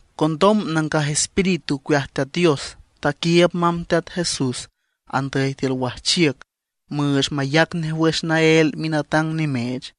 Condom Nangaj Espíritu ocueaj Teat Dios taquiiüb mamb Teat Jesús andüy tiül wajchiüc müüch mayac nej wüx naél minatang nimeech.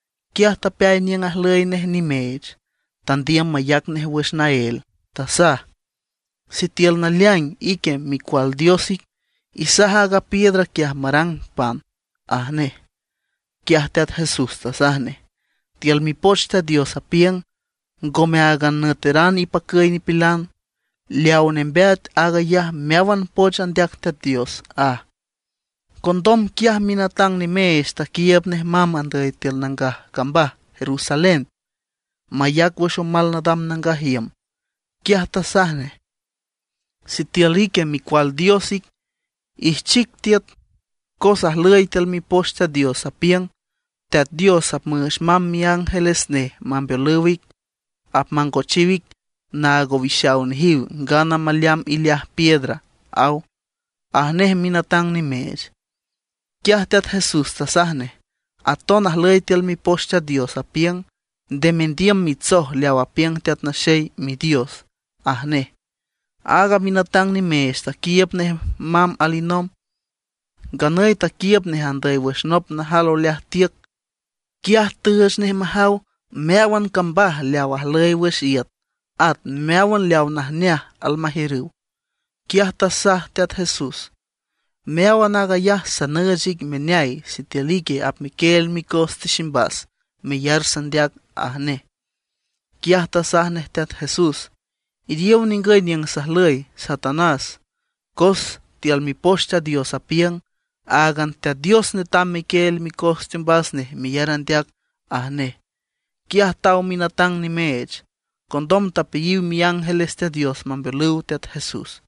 Quiaj tapeay niüng ajlüy nej nimeech, tandiüm mayac nej wüx naél, tasaj: ―Sitiül naleaing ique Micual Dios ic, isaj aaga piedra quiaj marang pan ―aj nej. Quiaj Teat Jesús tasaj nej: ―Tiül Mipoch Teat Dios apiüng: “Ngome áagan nüeteran ipacüy nipilan, leaw nembeat aag ayaj meáwan poch andeac Teat Dios” ―aj. Condom quiaj minatang nimeech taquiiüb nej mamb andüy tiül nangaj cambaj Jerusalén, mayac wüx omal nadam nangaj iüm. Quiaj tasaj nej: ―Sitiül ique Micual Dios ic, ijchic tiüt cos ajlüy tiül Mipoch Teat Dios, apiüng: Teat Dios apmüüch mamb miángeles nej mambeolüw ic. Apmangochiw ic naag owixaw nejiw ngana maleamb ileaj piedra, aw ―aj nej minatang nimeech. Quiaj Teat Jesús tasaj nej: ―Aton ajlüy tiül Mipoch Teat Dios, apiüng: “Nde mendiüm mitsoj leaw apiüng Teat Naxey Midios” ―aj nej. Aaga minatang nimeech taquiiüb nej mamb alinomb. Nganüy taquiiüb nej andüy wüx nop najal oleaj tiüc. Quiaj tüüch nej majaw meáwan cambaj leaw ajlüy wüx iüt at meáwan leaw najneaj almajiürüw. Quiaj tasaj Teat Jesús: ―Meáwan aag ayaj sanüüch ic meneay sitiül ique apmequieel micos tiximbas meyar sandeac ―aj nej. Quiaj tasaj nej Teat Jesús: ―Iriow ningüy niüng sajlüy, Satanás, cos tiül Mipoch Teat Dios apiüng: “Áagan Teat Dios netam mequieel micos teombas nej meyar andeac” ―aj nej. Quiaj taw minatang nimeech. Condom tapeayiw miángeles Teat Dios mambeolüw Teat Jesús.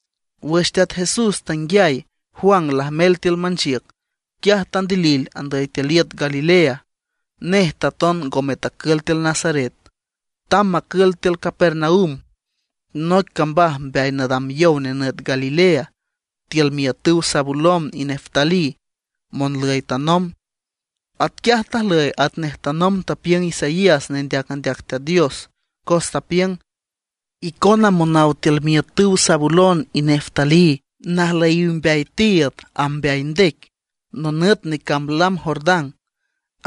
Wüx Teat Jesús tanguiay Juan lajmel tiül manchiüc, quiaj tandilil andüy tiül iüt Galilea. Nej taton ngome tacül tiül Nazaret, tamb macül tiül Capernaum, noic cambaj mbeay nadam yow nenüt Galilea, tiül miiütüw Zabulón y Neftalí, monlüy tanomb. Atquiaj tajlüy atnej tanomb tapiüng Isaías nendeac andeac Teat Dios, cos tapiüng: Icona monaw tiül miiütüw Zabulón y Neftalí, najlüyiw mbeay tiiüd amb mbeay ndec, nonüt necamb lam Jordán;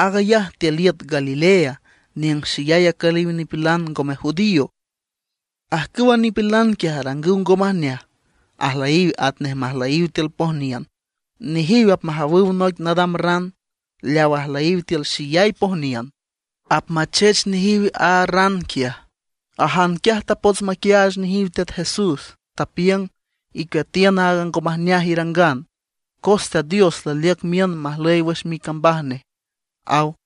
aag ayaj tiül iüt Galilea, niüng xeyay acüliw nipilan ngome judío. Ajcüwa nipilan quiaj arangüw ngo majneaj, ajlüyiw atnej majlüyiw tiül pojniün, nejiw apmajawüw noic nadam ran. Leaw ajlüyiw tiül xeyay pojniün, apmachech nejiw a ran quiaj. Ajan quiaj tapots maquiaach nejiw Teat Jesús, tapiüng: ―Icueatiün aaga ngo majneaj irangan, cos Teat Dios laliüc miün majlüy wüx micambaj nej ―aw.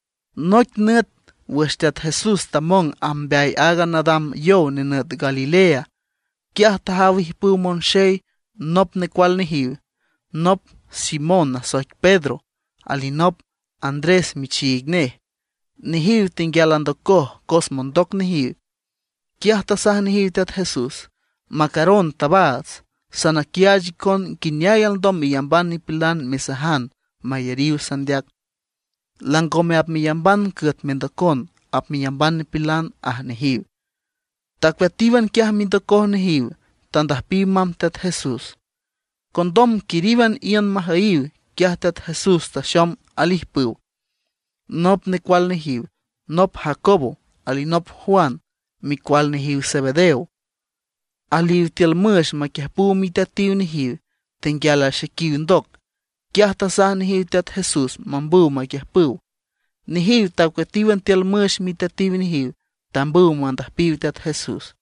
Noic nüt wüx Teat Jesús tamong amb mbeay aaga nadam yow nenüt Galilea, quiaj tajaw ijpüw monxey nop necual nejiw, nop Simón nasoic Pedro, alinop Andrés michiig nej. Nejiw tenguial andocoj cos mondoc nejiw. Quiaj tasaj nejiw Teat Jesús: ―Macaron tabaats, sanaquiaach icon nguineay alndom meyamban nipilan mesajan mayariw sandeac. Langome apmeyamban cüet mendocon, apmeyamban nipilan ―aj nejiw. Tacueatíwan quiaj mindocoj nejiw, tandüjpiw mamb Teat Jesús. Condom quiríwan iün majüyiw, quiaj Teat Jesús taxom alijpüw, nop necual nejiw, nop Jacobo, alinop Juan, micual nejiw Zebedeo. Aliw tiül müx maquiüjpüw miteatiw nejiw, tenguial axequiw ndoc. Quiaj tasaj nejiw Teat Jesús mambüw maquiüjpüw. Nejiw tacueatíwan tiül müx miteatiw nejiw, tambüw mandüjpiw Teat Jesús.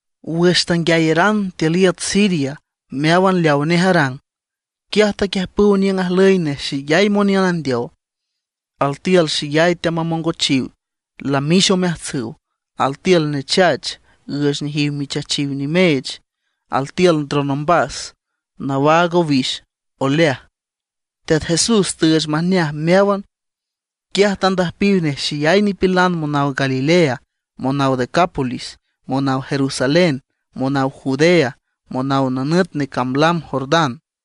Wüx tanguiayaran tiül iüt Siria meáwan leawa nej arang, quiaj taquiüjpüw niüng ajlüy nej xeyay moniün andeow. Altiül xeyay teamamongochiw, lamix omeajtsüw; altiül nechach, üüch nejiw michachiw nimeech; altiül ndron ombas, nawaag owix oleaj. Teat Jesús tüüch majneaj meáwan. Quiaj tandüjpiw nej xeyay nipilan monaw Galilea, monaw Decápolis, monaw Jerusalén, monaw Judea, monaw nonüt necamb lam Jordán.